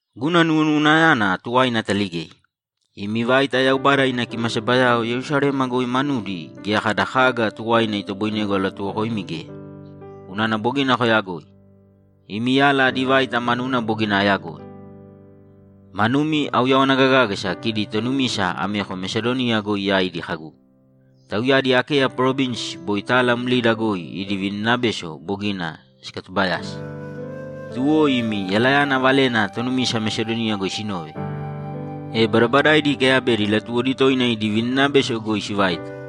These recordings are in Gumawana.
Guna nuwonuwanayana tuwaina ataligei. Imi vaita Yaubada ina kimasabayao Yerusalema goi manudi geya kada kaga tuwaina itoboinegu alatuwokoimi geya, unana bogina koyagoi. Imi yala adi vaita manuna bogina ayagoi; manumi auyawana gagágasa kidi tonumisa ameko Mesadoniya goi yaidi kagu, ‘Tauyadi Akeya parovinsi boi tala mlida goi idi vininabeso bogina sikatubayasi.’ Tuwo imi yalayana valena tonumisa Mesadoniya goi sinove, e badabadaidi ikeyabedi latuwodi toina idi vininabeso goi sivaita.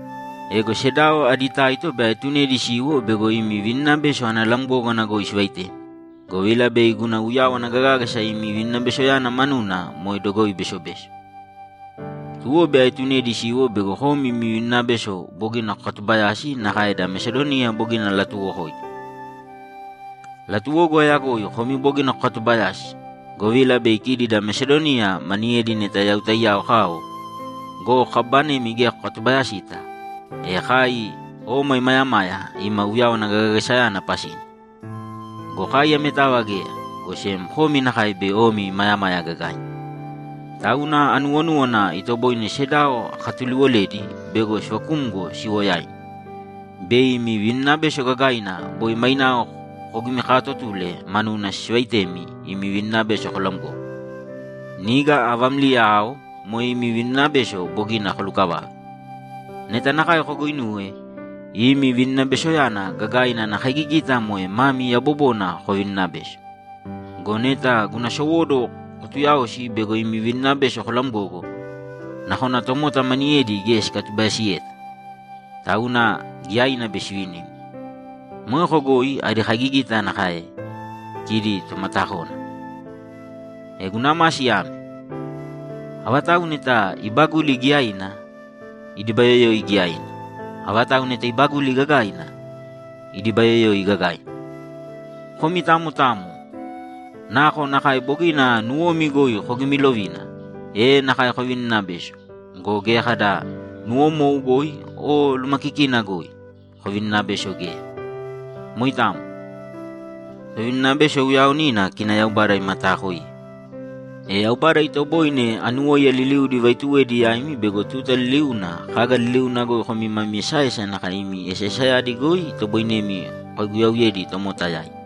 Ego sedao adi taito bei aetunedi siwo bego imi vininabeso ana lamgógana goi sivaitemi, govila bei guna uyawana gagágasa imi vininabesoyana manuna moe dogoi besobeso. Tuwo bei aetunedi siwo bego komi imi vininabeso bogina kokatubayasi nakae da Mesadoniya bogina alatuuwokoidi. Latuwogu ayagoi komi bogina kokatubayasi, govila bei kidi da Mesadoniya maniyedi neta yau taiyao kao go, kababanemi geya kokatubayasita, e kai oma imayamaya ima uyawana gagagasayana pasina. Go kai ametava geya, go sem komi nakae bei omi imayamaya gagaina. Tauna anuwonúwana itoboine sedao akatuliwoledi bego sivakumgo siwo yaimi, bei imi vininabeso gagaina boi mainao kogimikaatotule manuna sivaitemi imi vininabeso kolamgogo. Niga avámliya ao moe imi vininabeso bogina kolukavave. Neta nakae koguinuwe, imi vininabesoyana gagaina ana kaigigita moe mami yabobona kovininabeso. Go neta guna sowóduwo kotuyaosi bego imi vininabeso kolamgogo, nakona tomota maniyedi geya sikatubayasiyeta, tauna giyaina bei sivini. Moeko goi adi kaigigita nakae kidi tomatakónana. E guna masi ame: Avatau neta ibaguli giyaina, idibayoyoi giyaina. Avatau neta ibaguli gagaina, idibayoyoi gagaina. Komi tamo tamo nakonakae bogina nuwomi goi kogimilovina, e nakae kovininabēso go, geya kada nuwomou goi o lumakikina goi kovininabeso geya. Moitamo. Tovininabeso uyaaonina kina Yaubada imataakoiye. E Yaubada itoboine anuwóiya liliudi ivaituwedi yaimi bego tuta liliuna kaga liliuna goi komi mami esaesa nakae imi esaesayadi goi itoboinemi kokaiguyauyedi tomota yaidi.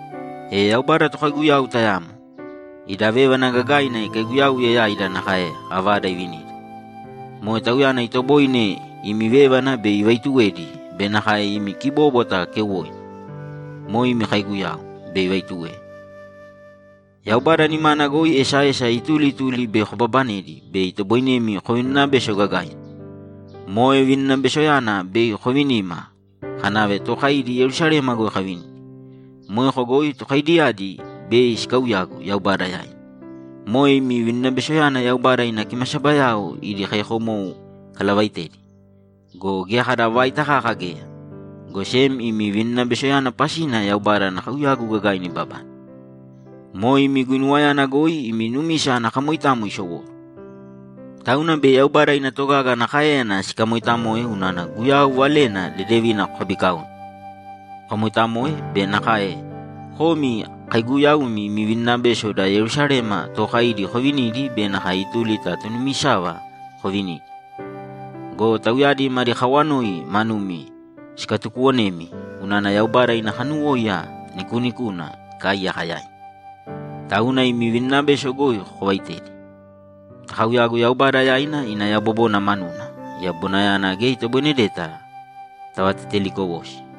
E Yaubada tokaiguyau tayamo. Ida vévana gagaina ikaiguyauye yaida nakae avada ivinida. Moe Tauyana itoboine imi vévana bei ivaituwedi be nakae imi kibóbwata keuwoina, moe imi kaiguyau, bei ivaituwe. Yaubada nimana goi esaesa ituli ituli bei kobabanedi be itoboinemi kovininabeso gagaina. Moe vininabesoyana bei kovinima kanave tookaidi Yerusalema goi kavinidi. Moeko goi tokaidiyadi bei sikauyagu Yaubada yaina. Moe imi vininabesoyana Yaubada ina kimasabayao idi kaiyakomou ikalavaitedi go, geya kada vaita kaka geya, go sem imi vininabesoyana pasina Yaubada ana kauyagu gagaina ibabane. Moe imi guinuwayana goi imi numisa ana kamoitamo isowóduwo. Tauna bei Yaubada ina togaga ana káeyana sikamoitamoe unana Guyau Valena Dedevina kokabikaone, kokamoitamoe be nakae komi kaaiguyaumi imi vininabeso da Yerusalema tookaidi kovinidi be nakae ituli ta tonumisava kovinidi. Go tauyadi madi kawanoi manumi sikatukuwonemi unana Yaubada ina kanuwóiya nikuunikuna ikaaiyaka yaimi, tauna imi vininabeso goi kovaitedi. Takauyāgu Yaubada yaina ina yabobona manuna. Yabobonayana geya itoboinedeta tavatetelikowosi.